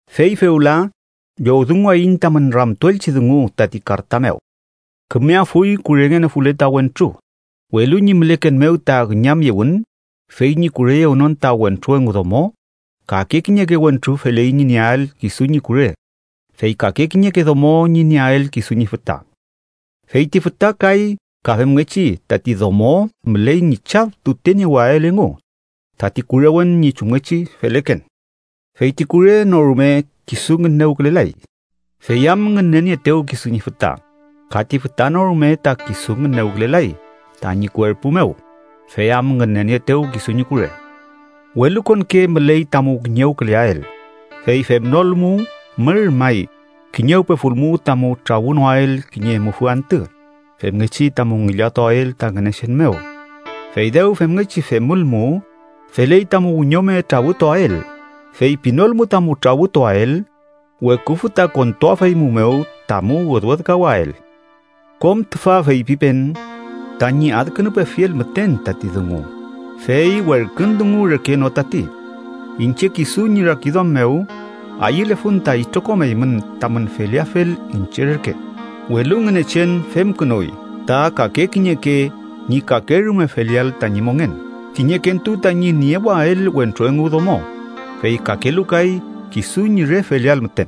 Fey fewla llowdunguwayiñ tamün ramtuelchi dungu tati karta mew. Kümeafuy kurengenofule ta wentru, welu ñi müleken mew ta üñamyewün, fey ñi kureyewnon ta wentru engu domo, kake kiñeke wentru feley ñi nieael kisu ñi kure, fey kake kiñeke domo ñi nieael kisu ñi füta. Fey ti füta kay ka femngechi tati domo müley ñi chaf tuteniewael engu tati kurewen ñi chumngechi feleken. Fey ti kure no rume kisu ngünewkülelay, fey am ngünenieetew kisu ñi füta, ka ti füta no rume ta kisu ngünewkülelay tañi kuerpu mew, fey am ngünenieetew kisu ñi kure. Welukonke müley tamu kiñewküleael, fey femnolmu mür may kiñewpefulmu tamu trawünoael kiñe mufü antü femngechi tamu ngillatuael ta Ngünechen mew. Fey dew femngechi femülmu, feley tamu wiñome trawütuael, fey pinolmu tamu trawütuael, weküfü ta kontuafeymumew tamu wedwedkawael. Kom tüfa feypipen tañi adkünupefiel müten tati dungu, fey werkün dungu reke no tati. Iñche kisu ñi rakiduam mew, ayülefun ta itrokom eymün tamün feleafel iñche reke, welu Ngünechen femkünuy ta kake kiñeke ñi kakerume feleael tañi mongen: kiñekentu tañi niewael wentru engu domo, fey kakelu kay kisu ñi re feleael müten.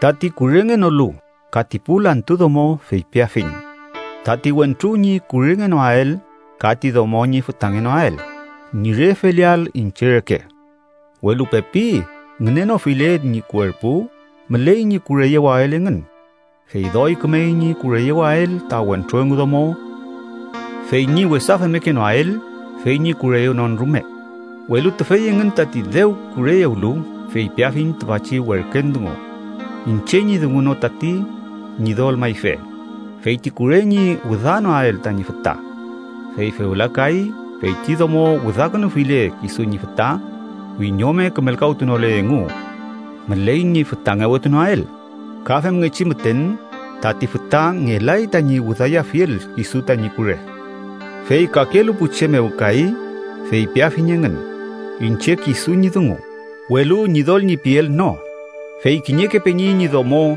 Tati kurengenolu ka ti pu lantu domo feypiafiñ: tati wentru ñi kurengenoael ka ti domo ñi fütangenoael ñi re feleael iñche reke. Welu pepi ngünenofile ñi kuerpu, müley ñi kureyewael engün, fey doy kümey ñi kureyewael ta wentru engu domo fey ñi wesa femmekenoael fey ñi kureyewnon rume. Welu tüfey engün tati dew kureyewlu, feypiafiñ tüfachi werken dungu, iñche ñi dungu no tati, Ñidol mayfe: fey ti kure ñi wüdanoael tañi füta Fey fewla kay, feyti domo wüdakünufile kisu ñi füta, wiñome kümelkawtunole engu, müley ñi fütangewetunoael. Ka femngechi müten, tati füta ngelay tañi wüdayafiel kisu tañi kure. Fey kakelu pu che mew kay, feypiafiñ engün, iñche kisu ñi dungu, welu Ñidol ñi piel no, fey kiñeke peñi ñi domo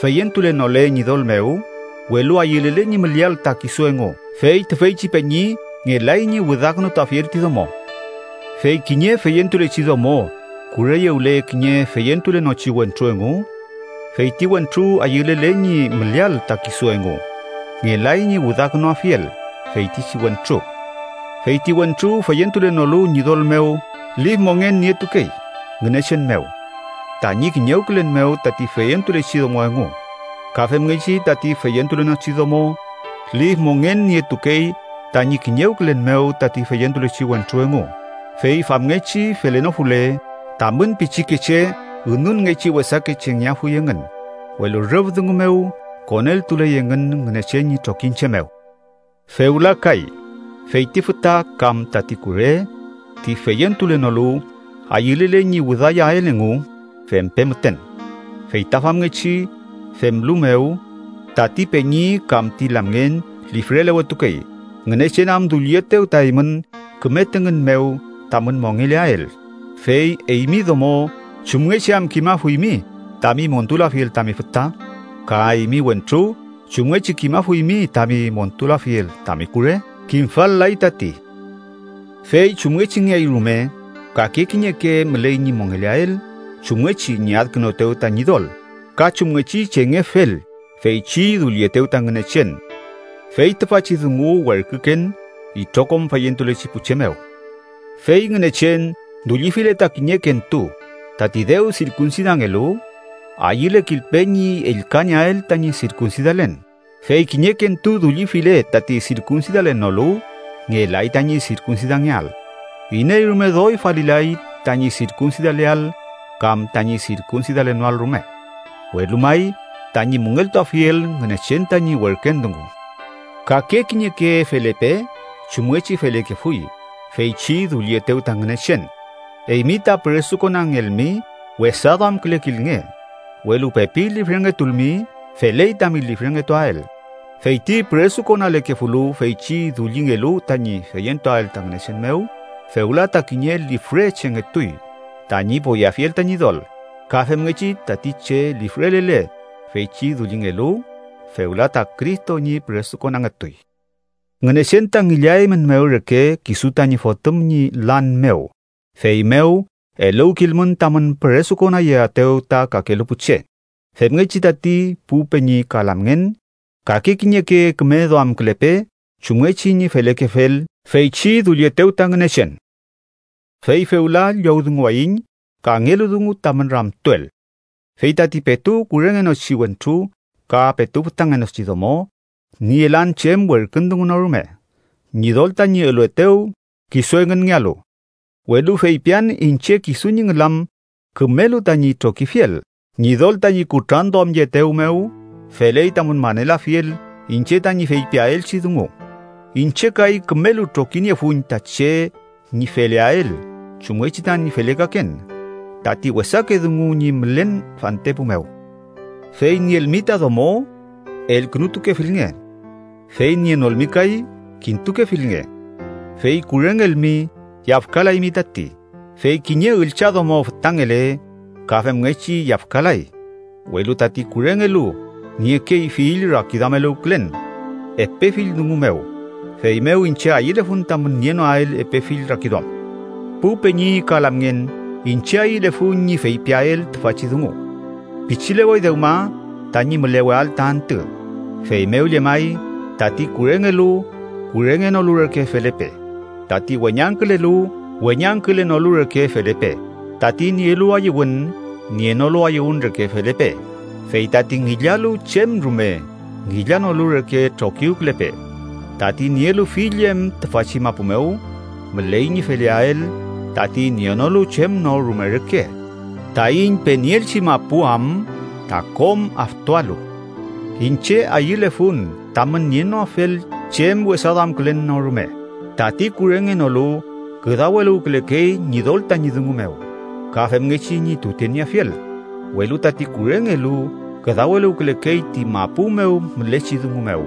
feyentulenole Ñidol mew, welu ayülele ñi müleael ta kisu engu, fey tüfeychi peñi ngelay ñi wüdakünutuafiel ti domo. Fey kiñe feyentulechi domo kureyewle kiñe feyentulenochi wentru engu, fey ti wentru ayülele ñi müleael ta kisu engu, ngelay ñi wüdakünuafiel feytichi wentru. Fey ti wentru feyentulenolu Ñidol mew lif mongen nietukey Ngünechen mew tañi kiñewkülen mew tati feyentulechi domo engu. Ka femngechi tati feyentulenochi domo, lif mongen nietukey tañi kiñewkülen mew tati feyentulechi wentru engu. Fey famngechi felenofule, tamün pichikeche ünunngechi wesake chengeafuy engün, welu rüf dungu mew, koneltuley engün Ngünechen ñi trokiñche mew. Fewla kay, fey ti füta kam tati kure, ti feyentulenolu, ayülele ñi wüdayael engu, fempe müten. Feyta famngechi femlu mew, tati peñi kam ti lamngen lifrelewetukey, Ngünechen am dullietew ta eymün küme tüngün mew tamün mongeleael. Fey, eymi domo, ¿chumngechi am kimafuymi tami montulafiel tami füta? ¿Ka eymi wentru, chumngechi kimafuymi tami montulafiel tami kure? Kimfal-lay tati. Fey chumngechingeay rume, kake kiñeke müley ñi mongeleael chumngechi ñi adkünuetew ta Ñidol, ka chumngechi chengefel feychi dullietew ta Ngünechen. Fey tüfachi dungu werküken itrokom feyentulechi pu che mew. Fey Ngünechen dullifile ta kiñekentu tati dew sirkunsidangelu, ayülekilpe ñi ellkanieael tañi sirkunsidalen. Fey kiñekentu dullifile tati sirkunsidalenolu, ngelay tañi sirkunsidangeael. Iney rume doy falilay tañi sirkunsidaleael kam tañi sirkunsidalenoael rume, welu may, tañi müngeltuafiel Ngünechen tañi werkün dungu. Kake kiñeke felepe chumngechi felekefuy feychi dullietew ta Ngünechen. Eymi ta püresukonangelmi, wesa duamkülekilnge, welu pepi lifrengetulmi, feley tami lifrengetuael. Fey ti püresukonalekefulu feychi dullingelu tañi feyentuael ta Ngünechen mew, fewla ta kiñe lifre chengetuy tañi poyeafiel ta Ñidol. Ka femngechi, tati che lifrelele feychi dullingelu, fewla ta Cristo ñi püresukonangetuy. Ngünechen ta ngillaeymünmew reke kisu tañi Fotüm ñi lan mew, feymew eluwkilmün tamün püresukonayeaetew ta kakelu pu che. Femngechi tati, pu peñi ka lamngen, kake kiñeke küme duamkülepe chumngechi ñi felekefel feychi dullietew ta Ngünechen. Fey fewla llowdunguwayiñ kangelu dungu tamün ramtuel: Fey tati petu kurengenochi wentru ka petu fütangenochi domo nielan chem werkün dungu no rume Ñidol tañi eluetew kisu engünngealu, welu feypian iñche kisu ñi ngülam kümelu tañi trokifiel. Ñidol tañi kutranduamyeetew mew, feley tamün manelafiel iñche tañi feypiaelchi dungu. Iñche kay kümelu trokiniefun ta che ñi feleael chumngechi tañi felekaken, tati wesake dungu ñi mülen fantepu mew. Fey nielmi ta domo, elkünutukefilnge. Fey nienolmi kay, kintukefilnge Fey kurengelmi, yafkalaymi tati, fey kiñe üllchadomo fütangele, ka femngechi yafkalay. Welu tati kurengelu niekey fill rakiduameluwkülen epe fill dungu mew, feymew iñche ayülefun tamün nienoael epe fill rakiduam. Pu peñi ka lamngen, iñche ayülefun ñi feypiael tüfachi dungu: Pichilewey dewma tañi müleweael ta antü. Feymew llemay, tati kurengelu, kurengenolu reke felepe. Tati weñangkülelu, weñangkülenolu reke felepe. Tati nielu ayüwün, nienolu ayüwün reke felepe. Fey tati ngillalu chem rume, ngillanolu reke trokiwkülepe. Tati nielu fill em tüfachi mapu mew, müley ñi feleael tati nienolu chem no rume reke, taiñ penieelchi mapu am ta kom aftualu. Iñche ayülefun tamün nienoafel chem wesaduamkülen no rume. Tati kurengenolu küdaweluwkülekey Ñidol tañi dungu mew, ka femngechi ñi tutenieafiel, welu tati kurengelu küdaweluwkülekey ti mapu mew mülechi dungu mew,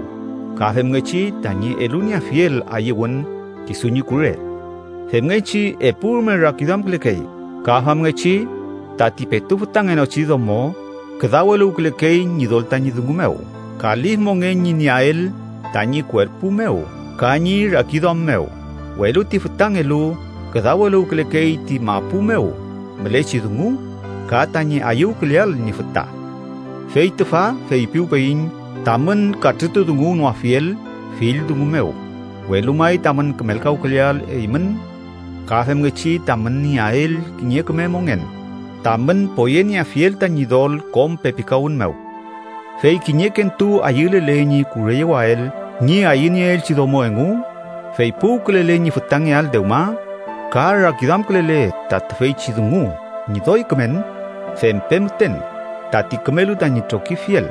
ka femngechi tañi elunieafiel ayüwün kisu ñi kure, femngechi epurume rakiduamkülekey. Ka famngechi tati petu fütangenochi domo, küdaweluwkülekey Ñidol tañi dungu mew, ka lif mongen ñi nieael tañi kuerpu mew ka ñi rakiduam mew, welu ti fütangelu küdaweluwkülekey ti mapu mew mülechi dungu ka tañi ayüwküleael ñi füta. Fey tüfa feypiwpeyiñ tamün katrütudunguwnoafiel fill dungu mew, welu may tamün kümelkawküleael eymün, ka femngechi tamün nieael kiñe küme mongen, tamün poyenieafiel ta Ñidol kom pepikawün mew. Fey kiñekentu ayülele ñi kureyewael ñi ayünieelchi domo engu, fey puwkülele ñi fütangeael dewma, ka rakiduamkülele ta tüfeychi dungu ñi doy kümen, fempe müten tati kümelu tañi trokifiel.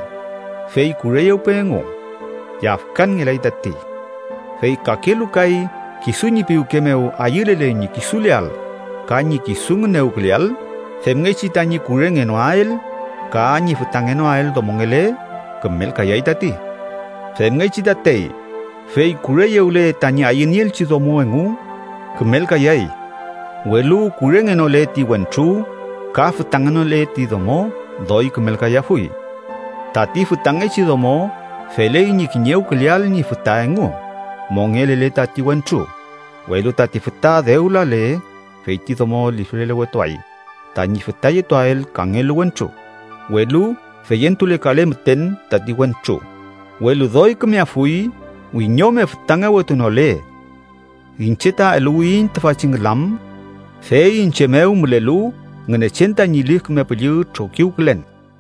Fey kureyewpe engu. Yafkanngelay tati. Fey kakelu kay, kisu ñi piwke mew ayülele ñi kisuleael ka ñi kisu ngünewküleael, femngechi tañi kurengenoael ka ñi fütangenoael domongele, kümelkayay tati. Femngechi tatey, fey kureyewle tañi ayünieelchi domo engu, kümelkayay, welu kurengenole ti wentru ka fütangenole ti domo, doy kümelkayafuy. Tati fütangechi domo feley ñi kiñewküleael ñi füta engu mongelele tati wentru. Welu tati füta dew lale, fey ti domo lifrelewetuay tañi fütayetuael kangelu wentru, welu feyentulekale müten tati wentru, welu doy kümeafuy wiñome fütangewetunole. Iñche ta eluwiyiñ tüfachi ngülam, fey iñche mew mülelu Ngünechen tañi Lif Küme Püllü trokiwkülen.